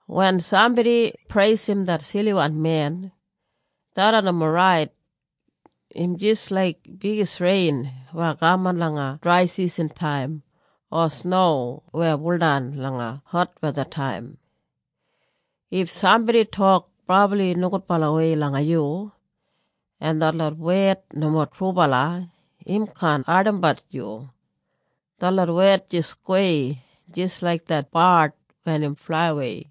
Wen sambodi preisim det siliwan men, tharran nomo rait. Im jis laik bigis rein weya kaman langa draisisantaim, o sno weya buldan langa hotwethataim. If sambodi tok brabli nogudbalawei langa yu en detlot wed nomo trubala im kaan ardimbat yu. Detlot wed jis gowei, jis laik det bard wen im flaiwei.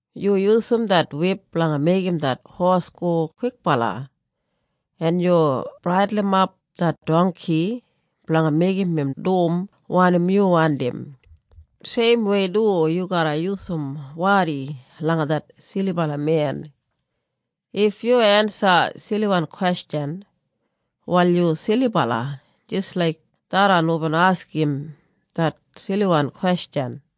Yu yusum det wip blanga meigim det hos go kwikbala en yu braidulimap det dongki blanga meigim im dum wanim yu wandim. Seimwei du yu garra yusum wadi langa det silibala men. If yu ensa siliwan kwestjan, wal yu silibala jis laik tharran hubin askim det siliwan kwestjan.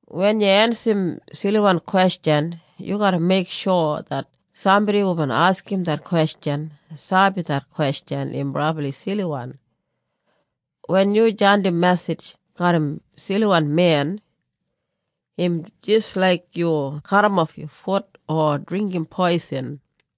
Wen yu ensim siliwan kwestjan, yu garra meiksho det sambodi hubin askim det kwestjan sabi det kwestjan im brabli siliwan. Wen yu jandim mesij garram siliwan men, im jis laik yu kadimof yu fut o dringgim poisin.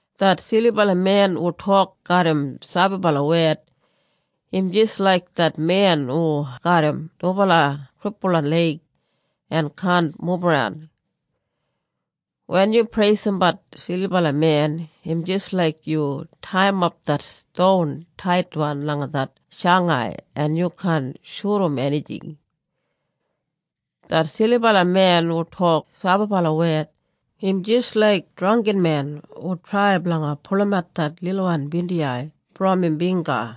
Det silibala men hu tok garram sabibala wed, im jis laik det men hu garram dubala kripulwan leig en kaan mubaran. Wen yu preisimbat silibala men, im jis laik yu taiyimap det ston taitwan langa det shangai en yu kaan shudum enijing. Det silibala men hu tok sabibala wed, im jis laik drangginmen hu trai blanga pulumat det lilwan bindiyai brom im bingga.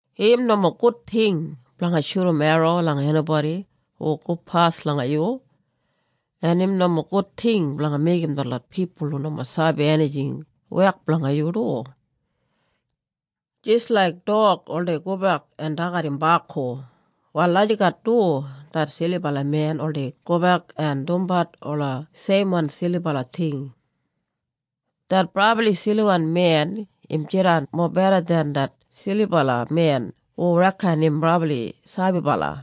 Im nomo gud ting blanga shudum erro langa enibodi hu gopas langa yu, en im nomo gud ting blanga meigim detlot pipul hu nomo sabi enijing wek blanga yu du. Jis laik dog oldei gobek en dagat im baku, wal lagijat du det silibala men oldei gobek en dumbat ola seimwan silibala ting. Det brabli siliwan men im jidan mobeda den det silibala men hu reken im brabli sabibala.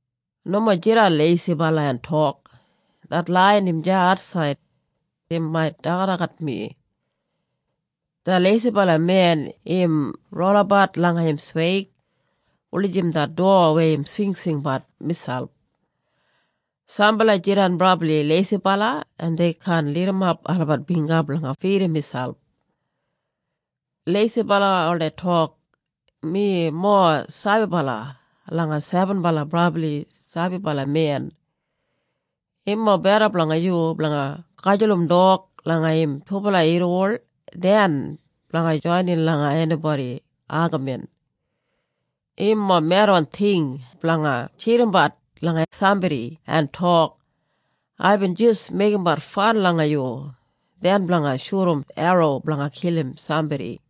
Nomo jidan leisibala en tok, “Det laiyan im deya atsaid. Im mait dagadagat mi.” Det leisibala men im rolabat langa im sweig wulijim det dowa weya im swingswingbat miselp. Sambala jidan brabli leisibala en dei kaan lidimap olabat bingga blanga fidim miselp. Leisibala oldei tok, “Mi mowa sabibala langa sebenbala brabli sabibala men.” Im mobeda blanga yu blanga gajulum dog langa im dubala irriwol den blanga joinin langa enibodi agamin. Im mowa medwan ting blanga tjidimbat langa sambodi en tok, “Aibin jis meigimbat fan langa yu,” den blanga shudum erro blanga kilim sambodi.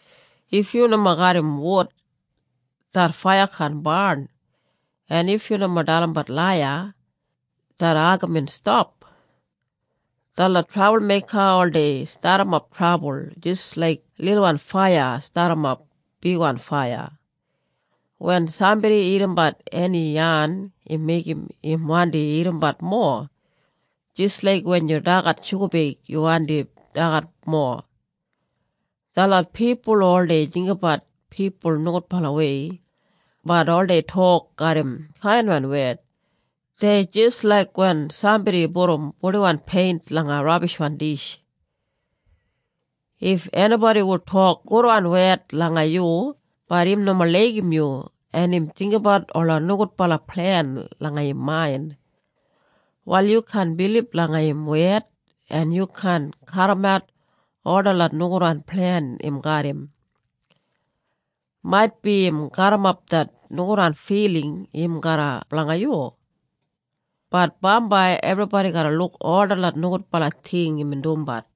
If yu nomo garram wud, det faiya kaan barn, en if yu nomo dalimbat laiya, det agamin stap. Detlot trabulmeika oldei stadimap trabul, jis laik lilwan faiya stadimap bigwan faiya. Wen sambodi irrimbat eni yan im meigim im wandi irrimbat mowa, jis laik wen yu dagat shugabeig yu wandim dagat mowa. Detlot pipul hu oldei jinggabat pipul nogudbalawei bat oldei tok garram kainwan wed, dei jis laik wen sambodi pudum purdiwan peint langa rabishwan dish. If enibodi hu tok gudwan wed langa yu bat im nomo laigim yu en im jinggabat ola nogudbala plen langa im main, wal yu kaan bilib langa im wed en yu kaan kaundimap ol detlot nogudwan plen im garram. Maitbi im gaburrumap det nogudwan filing im garram blanga yu, bat bambai ebribodi garra luk ol detlot nogudbala ting imbin dumbat.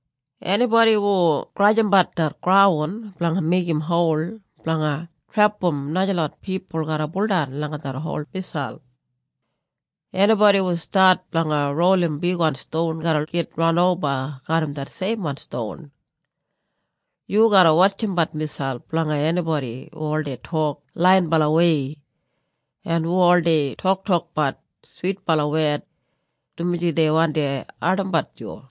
Enibodi hu grajimbat det graun blanga meigim hol blanga trepam najalot pipul garra buldan langa det hol miselp. Enibodi hu stat blanga rolim bigwan ston garra git ranoba garram det seimwan ston. Yu garra wotjimbat miselp blanga enibodi hu oldei tok laiyinbalawei en hu oldei toktokbat switbala wed, dumaji dei wandi ardimbat yu.